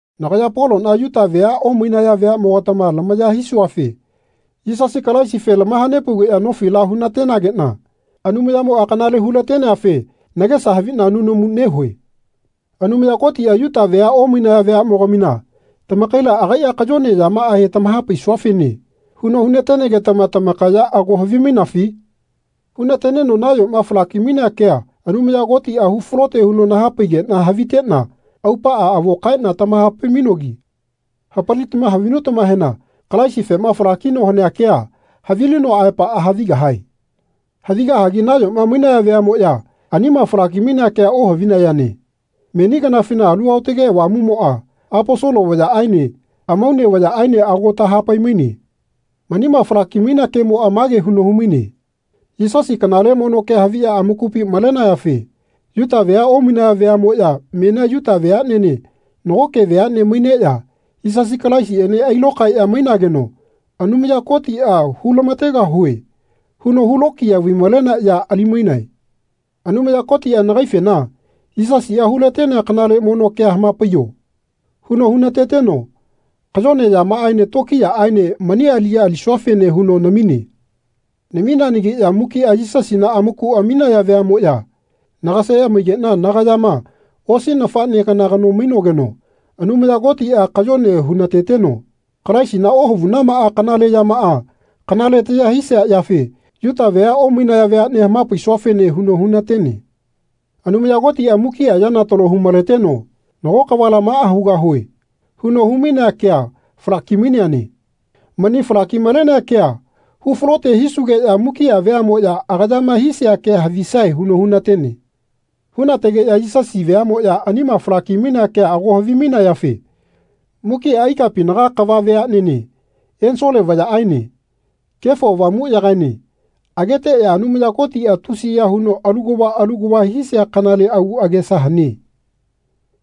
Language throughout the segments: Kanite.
Nagaya Polona Yuta vea omainaya veamogatama lamaya hisuafe Yisasi Kalaisife lamahanepaugeya nofila hunatenagena Anumayamoa kanale hu-lateneafe nagesa havina nunamu nehue. Anumaya Kotia Yuta vea omainaya veamogamina tamakaila agaia kayone yamaahe tamahapaisuafene huno hunatenegetama tamakaya ago havimainafi? Hunateneno nayoma falaki-mainea kea Anumaya Kotia hu falote huno nahapaigena havitena aupaa avo kaena tamahapai-mainogi hapalitama havinutamahena Kalaisifema falakino hanea kea havilinoa aepaa havigahae. Havigahagi nayoma mainaya veamoya anima falaki-mainea kea ohavinayane meni kanafina Alu Aotage Avamumoa Aposolo vayaene amaune vayaaene ago tahapai-maine. Manima falaki-mainea kemoa mage huno humaine Yisasi kanale mono kea haviya amakupi malenayafe Yuta vea omainaya veamoya menia Yuta veanene nagoke veane maineya Yisasi Kalaisiene ailokaeya mainageno Anumaya Kotia Hulamategahue. huno hulokiya vai-malenea ya ali-mainae. Anumaya Kotia nagaifena Yisasia hulatenea kanale mono kea hamapaiyo. huno hunateteno kayone yamaaene tokiyaaene mani aliya alisuafene huno namine. Namineanagiya mukia Yisasina amaku aminaya veamoya nagaseya maigena nagayama osi nafane kana kano mainogeno Anumaya Kotia kayone hunateteno Kalaisina ohavunamaa kanale yamaa kanale taya hisia yafe Yuta vea omainaya veane hamapaisua-fene huno hunatene. Anumaya Kotia mukia yana talo humaleteno Nago kavala maa hugahue. huno humainea kea falaki-maleneane. Mani falaki-malenea kea hufalote hisugeya mukia veamoya agayama hisia kea havisae huno hunatene. Hunategeya Yisasi veamoya anima falaki-mainea kea ago havimainayafe mukia ikapinaga kava veanene ensole vayaene Kefo Avamuyagaene ageteya Anumaya Kotia tusiya huno alu kava alu kava hisia kanale agu agesa hane.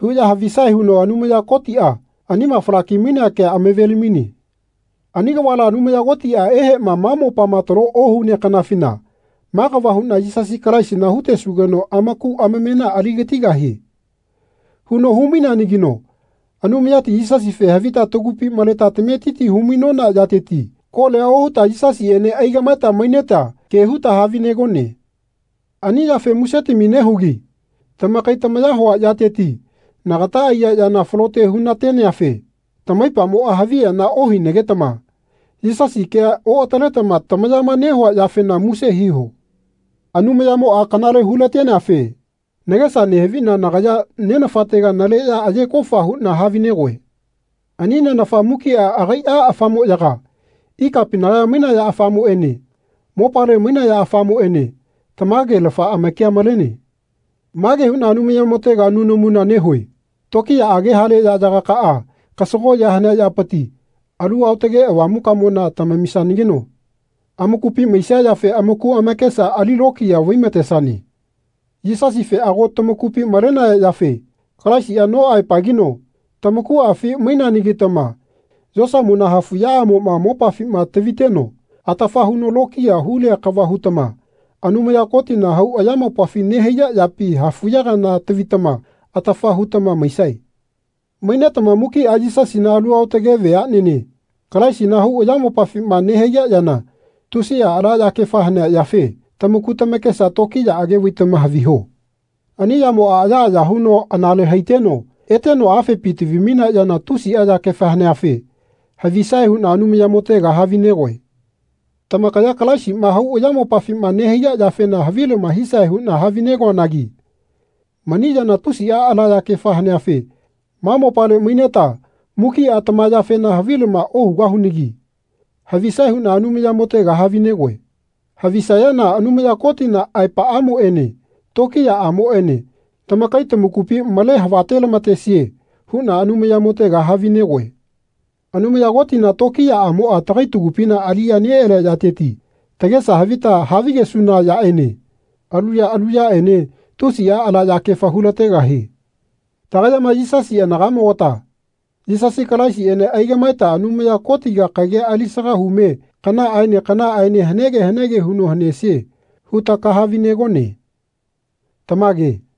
huya havisae huno Anumaya Kotia anima falaki-mainea kea amaveli-maine. Ani kavala Anumaya Kotia ehema ma mopama talo ohunea kanafina Ma kava huna Yisasi Kalaisina hutesugeno amaku amamena aligatigahie. huno hu-maineanagino Anumayati Yisasife havita tagupi maleta tametiti humainona yateti kolia ohuta Yisasiene aigamaeta maineta ke huta havinegone. Ani yafe musetami nehugi tamakai tamaya hua yateti nagata aiya yana falote hunateneafe tamaipamoa haviyana ohinagetama Yisasi kea oataletama tamayama nehua yafena muse hiho. Anumayamoa kanale hu-lateneafe nagesa nehavina nagaya Nenafatega naleya aye kofa huna havinegoe. Ani Nenafa mukia agaia afamoyaga ikapinaga mainaya afamoene mopale mainaya afamoene tamagelafa amakia malene. Mage huna Anumayamotega nunamuna nehue Tokiyaage hale yayagakaa kasagoya hanea yapiti Alu Aotage Avamukamona tamamisanageno amakupi maisia yafe amaku amakesa alilokiya vaimatesane. Yisasife ago tamakupi malenaya yafe Kalaisia no aepagino tamakuafi maineanagitama yosamona hafuyaamoma mopafima taviteno atafa huno lokiya hulia kava hutama Anumaya Kotina hau ayamopafi nehaiya yapi hafuya kana tavitama atafa hutama maisae. Mainetama mukia Yisasina alu aotage veanene Kalaisina hau ayamopafima nehaiya yana tusia ala yakefa hanea yafe tamaku tamakesa tokiyaage vaitama haviho. Ani yamoa ayaaya huno anale haiteno eteno afepi tavi-mainea yana tusia yakefa haneafe havisae huna Anumayamotega havinegoe. Tamakaya Kalaisima hau ayamopafima nehaiya yafena havilama hisae huna havine-goanagi mani yana tusia ala yakefa haneafe ma mopale maineta mukia tama yafena havilama ohugahunagi havisae huna Anumayamotega havinegoe. Havisayana Anumaya Kotina aepaamoene tokiyaamoene tamakai tamakupi male havate-lamatesie huna Anumayamotega havinegoe. Anumaya Kotina tokiyaamoa tagai tagupi aliyana nealia yateti tagesa havita havigesuna yaene alu ya alu yaene tusia ala yakefa hulategahie. Tagayama Yisasi anagamogata Yisasi Kalaisiene aigamaeta Anumaya Kotiga kagia alisaga hume kanaaene kanaaene hanege hanege huno hanesie huta kahavi-negone. Tamage.